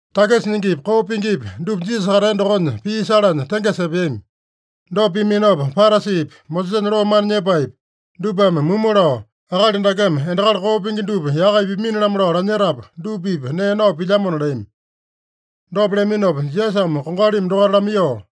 Takisa nyingipi, koo pingipi dupa Jisasa katea dokonya pii salanya tengesa epeami. Dopa piaminopa Parasipi, Mosesanya loo mana nyepaepi, dupame mumu lao, “Akali dakeme endakali koo pingi dupa yaka ipaminona lao lanyetapu, dupa-pipa nee nao pilyamona” leami. Dopa leaminopa Jisasame kongalimi dokaita lamaiyoo,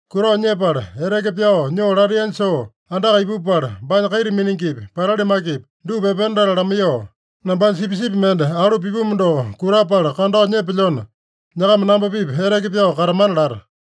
Kutao nyepala, eteke pyao nyoo lataiyanya soo andaka ipupala, baanya kaita miningipi, patali makepi, dupa epena latala lamaiyoo, ‘Nambanya sipisipi mende alu pipumu doko kutapala kandao nyepelyona, nyakama namba-pipa eteke pyao katamana’ lata.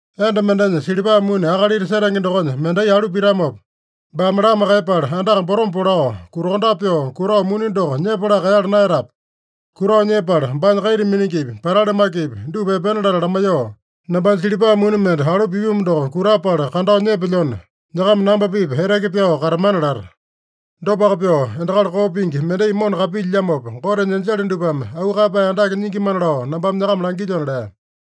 “Enda mendenya silipa muni akalita setenge dokonya mendai alu pitamopa, baame lama kaiyepala, andaka potoma polao, kutakondape pyoo kutao muni doko nyepalaka kaeyala naeyatape? Kutao nyepala, baanya kaita miningipi, patali makepi, dupa epena latala lamaiyoo, ‘Nambanya silipa muni mende alu pipumu doko kutapala kandao nyepelyona, nyakama namba-pipa eteke pyao katamana’ lata. Dopaka pyoo, endakali koo pingi mendai mona kapilyilyamopa, Gotenya enjele dupame auu kaeyapae andake nyingimana lao nambame nyakama langilyona” lea.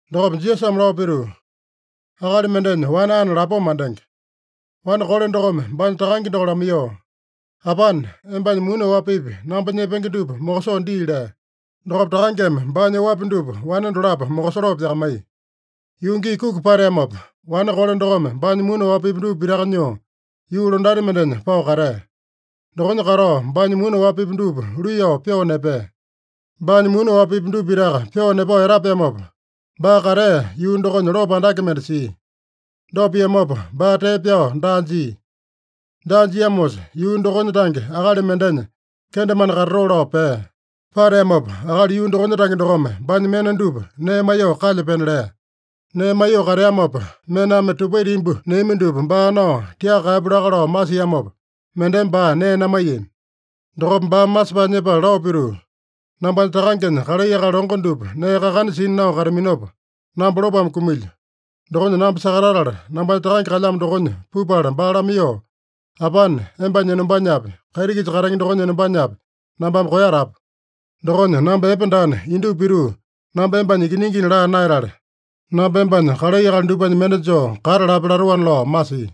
Dokopa Jisasame lao pituu, “Akali mendenya wane ane lapoma mandenge. Wane kole dokome baanya takange doko lamaiyoo, ‘Apane, embanya muni oapipi namba nyepenge dupa mokosoo dii’ lea. Dokopa takangeme baanya oapi dupa wane dolapo mokosoloo pyakamaiya. Yuu gii kuki pateamopa, wane kole dokome baanya muni oapipi dupa pitaka nyoo, yuu londati mendenya pao katea. Dokonya katao baanya muni oapipi dupa luiyao pyoo nepea. Baanya muni oapipi dupa pitaka pyoo nepao etapeamopa, baa katea yuu dokonya lopo andake mende sia. Dopa piamopa baa tee pyao daa jia. Daa jiamosa, yuu dokonya tange akali mendenya kendemane katatoo lao pea. Pateamopa akali yuu dokonya tange dokome baanya mena dupa nee maiyoo kalya pena lea. Nee maiyoo kateamopa, mename tupaita imbu neami dupa baa nao tiaka kaeyapu laka lao masiamopa, mendeme baa nee namaiyami. Dokopa baame masepae nyepala lao pituu, ‘Nambanya takangenya kalai akali longo dupa nee kakana sina nao kataminopa, namba lopome kumilyo. Dokonya namba sakatatala, nambanya takange kalyamo dokonya pupala baa lamaiyoo, “Apane, embanya enombanyapi, kaiti-kisa katenge dokonya enombanyapi, nambame koeyatapu. Dokonya namba epe daana, indupa pituu namba embanya ikiningina laa naeyatale, namba embanya kalai akali dupanya mende joo kata lape” latoana’ lao masia.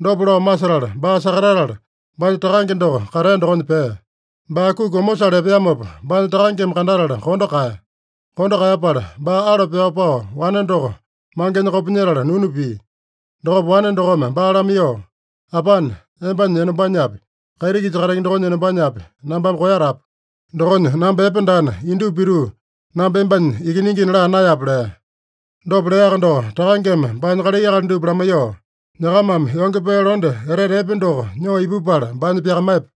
Dopa lao masetala, baa sakatatala baanya takange doko katea dokonya pea. Baa kuki omosale epeamopa, baanya takangeme kandatala kondo kaeya. Kondo kaeyapala, baa alo pyao pao wane doko mangenya kopinyetala nunu pia. Dokopa wane dokome baa lamaiyoo, ‘Apane, embanya enombanyapi, kaiti-kisa katenge dokonya enombanyapi, nambame koeyatapu. Dokonya namba epe daana, indupa pituu namba embanya ikiningina laa naeyape’ lea. Dopa leaka doko, takangeme baanya kalai akali dupa lamaiyoo, ‘Nyakamame yonge pee londe etete epe doko nyoo ipupala baanya pyakamaiyepa.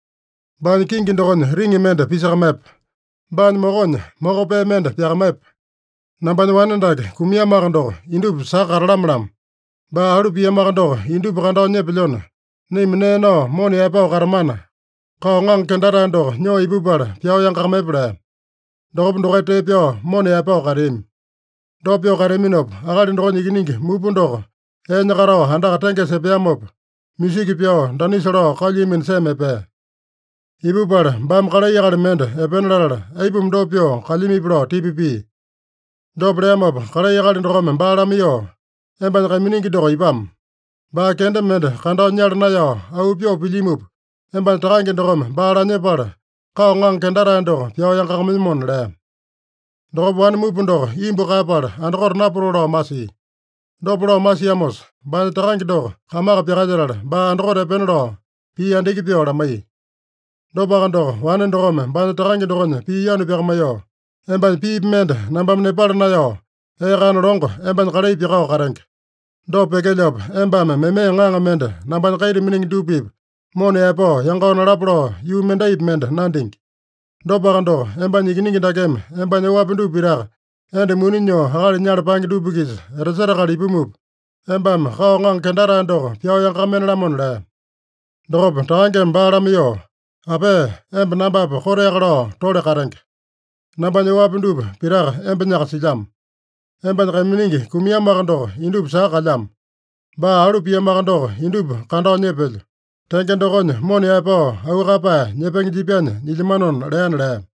Baanya kingi dokonya riŋi mende pisakamaiyepa. Baanya mokonya moko pee mende pyakamaiyepa. Nambanya wane dake kumiamoaka doko, indupa saka katalame-lamo. Baa alu piamoaka doko, indupa kandao nyepelyona, naima nee nao mona yaepao katamana, kao ŋaŋa kendatae doko nyoo ipupala pyao yangakamaiyepa’ lea. Dokopa dokaita tee pyao mona yaepao kateami. “Dopa pyoo kateaminopa, akali dokonya ikiningi mupa doko eenya katao andaka tengesa epeamopa, musiki pyao, danisa lao kalyuiyamino sema epea. Ipupala baame kalai akali mende epena latala, aipuma dopa pyoo kalyamipi lao tipa pia. Dopa leamopa kalai akali dokome baa lamaiyoo, ‘Embanya kaiminingi doko ipamo. Baa kenda mende kandao nyala naeyao auu pyoo pilyimupa, embanya takange dokome baa lanyepala, kao ŋaŋa kendatae doko pyao yangakamaiyomona’ lea. Dokopa wane mupa doko imbu kaeyapala andakote napatoo lao masia. Dopa lao masiamosa, baanya takange doko kamaka pyakalyetala, baa andakote epena lao pii andiki pyoo lamaiya. Dopaka doko, wane dokome baanya takange dokonya pii yanu pyakamaiyoo, ‘Embanya piipi mende nambame nepala naeyao, ee kana longo embanya kalai pyakao katenge. Dopa pyekelyopa, embame meme ŋaŋa mende nambanya kaita miningi dupa-pipa mona yaepao yangao nalapa lao yuu mendaipi mende nandingi. Dopaka doko, embanya ikiningi dakeme embanya oapi dupa pitaka enda muni nyoo akali nyala paenge dupa-kisa etasetakala ipumupa, embame kao ŋaŋa kendatae doko pyao yangakamaiyene-lamona!’ lea. Dokopa takangeme baa lamaiyoo, ‘Apea, emba nambapa koteaka lao tole katenge. Nambanya oapi dupa pitaka embanyaka silyamo. Embanya kaiminingi kumiamoaka doko indupa saka kalyamo. Baa alu piamoaka doko indupa kandao nyepelyo. Tenge dokonya mona yaepao auu kaeyapae nyepenge jipyanya nyilyamanona’ leana” lea.